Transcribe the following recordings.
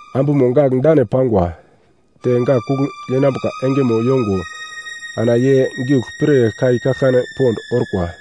Ambumo gak dane pangwa. Te gak kugl yenambuka engemo yongo, ana ye giugl pir kai kaglkane pond orkwa.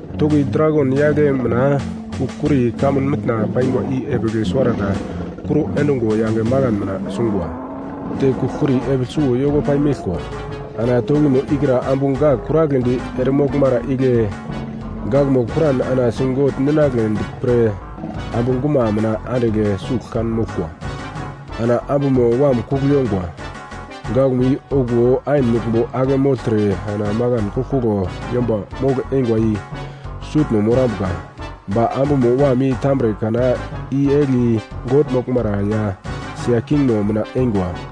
Toki dragon yagle mina kugl-kuri kamun mitna pangwa i epigl suwarata kuro endungo yange makan mina sungwa. Te kugl-kuri epigl suwo yoko pai meglkwa. Ana tokimo ikra ambu gak kuragledi eremoglmara igle gakmo kuran ana sigogl ninagledi pre ambu guma mina andigl sugl kan moglkwa. Ana ambumo wam kugl yongwa. Gakmo i okuwo ain muglmbo ake mogltre ana makan koglkoglo yomba mogl-eingwa i sutno morambuka. Ba ambumo wam i tambre kana i-egli God moglmara ya sia kingmo mina eingwa.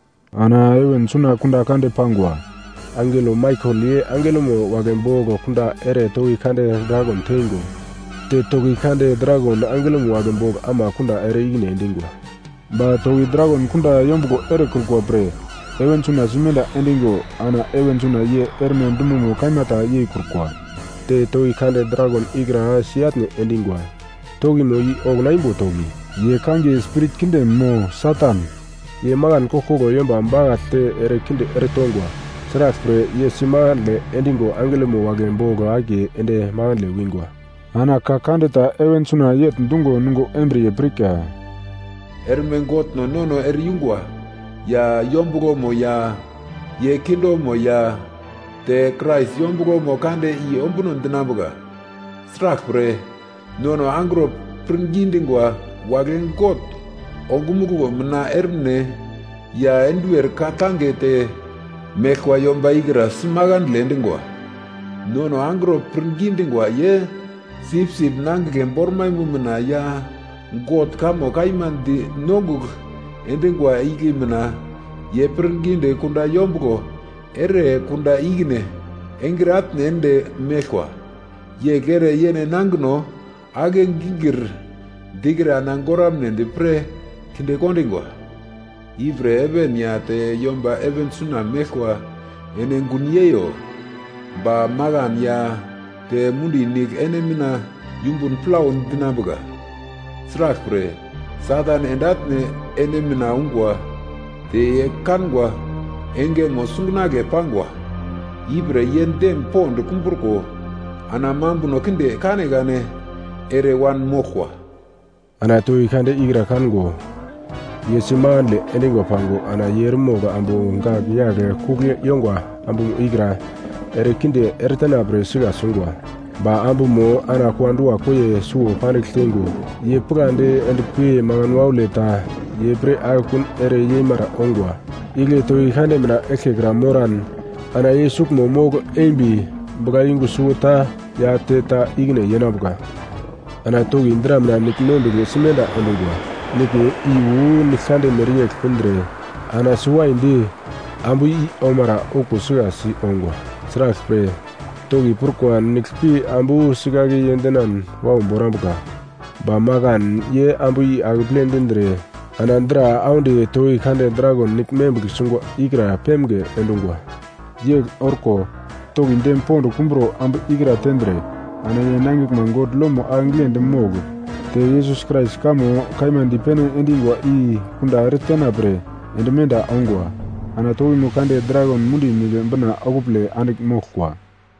Ana heven suna kunda kande pangwa. Angelo Maikel ye angelomo wagle bogl kunda ere toki kande dragon teingo, te toki kande dragon angelomo wagle bogl ama kunda ere ikine endingwa. Ba toki dragon kunda yombuglo erekrukwa pre heven suna simenda endigo ana heven suna ye erme dumomo kaima ta yeikrukwa. Te toki kande dragon ikra si-atne endingwa, tokimo i okuna imbo toki, ye kangiye spirit kinde mo Satan. Ye makan koglkoglo yomba bakaglte erekinde eretongwa. Sraglpre, ye si makandle endigo angelomo wagle bogl akiye ende makandle wingwa. Ana ka kande ta heven suna yegl dungo nungo embriye pirka: “Erme Godno nono ere-yungwa, ya yombuglomo ya ye kingdomo ya te Krais yombuglomo kande i ombuno dinambuka. Sraglpre, nono angro pirngi dingwa wagle God ongumuglo mina ermine ya enduwer ka-tange te meglkwa yomba ikra si makandle endingwa. Nono angro pirngi dingwa ye Sipsip Nangigle bormaimo mina ya God kamo kaima di nongugl endingwa igle mina ye pirngidi kunda yombuglo ere kunda ikine engre atne ende meglkwa. Yegl ere yene nangino ake-gingir dikre ana goramnedi pre kinde kondingwa. Ipre heven ya te yomba heven suna meglkwa ene gun yeiyo! Ba makan ya te mundi nigl ene mina yumbun plau dinambuka! Sraglpre, Satan ende atne ene mina ungwa te ye kangwa engemo sungunagle pangwa, ipre ye dem pond kumbruko ana mambuno kinde kanekane ere wanmoglkwa.” Ana toki kande ikra kango, ye si makandle endingwa pango ana ye eremogl ambu gak yagl kugl yongwa ambumo ikra erekinde eretena pre sika sungwa. Ba ambumo ana kua-dua koiyemo suwo pandigl teingo ye pigladi endpi makan waule ta ye pre akekun ere yeimara ongwa, igle toki kande mina eglkekra moran ana ye suglmo wakai mogl eimbi buglayungu suwota ya te ta ikine yenambuka. Ana toki dra mina nigl membigl simenda endungwa. Niglmo i wu nigl kande mereyegl pindre ana si waidi ambu i omara okuwo sikasi ongwa. Sraglpre, toki prukwa nigl pi ambu sikake yendenan wau borambuka. Ba makan ye ambu i akeple dindre ana dra audi toki kande dragon nigl membigl sungwa ikra pemge endungwa. Yegl orko, toki dem pond kumburo ambu ikra tendre, ana ye nangiglma God lomo ake giglendi mogl te Yesus Krais kamo kaima dipene endingwa i kunda eretena pre ende menda ongwa. Ana tokimo kande dragon mundi nigl bina okupole andigl moglkwa.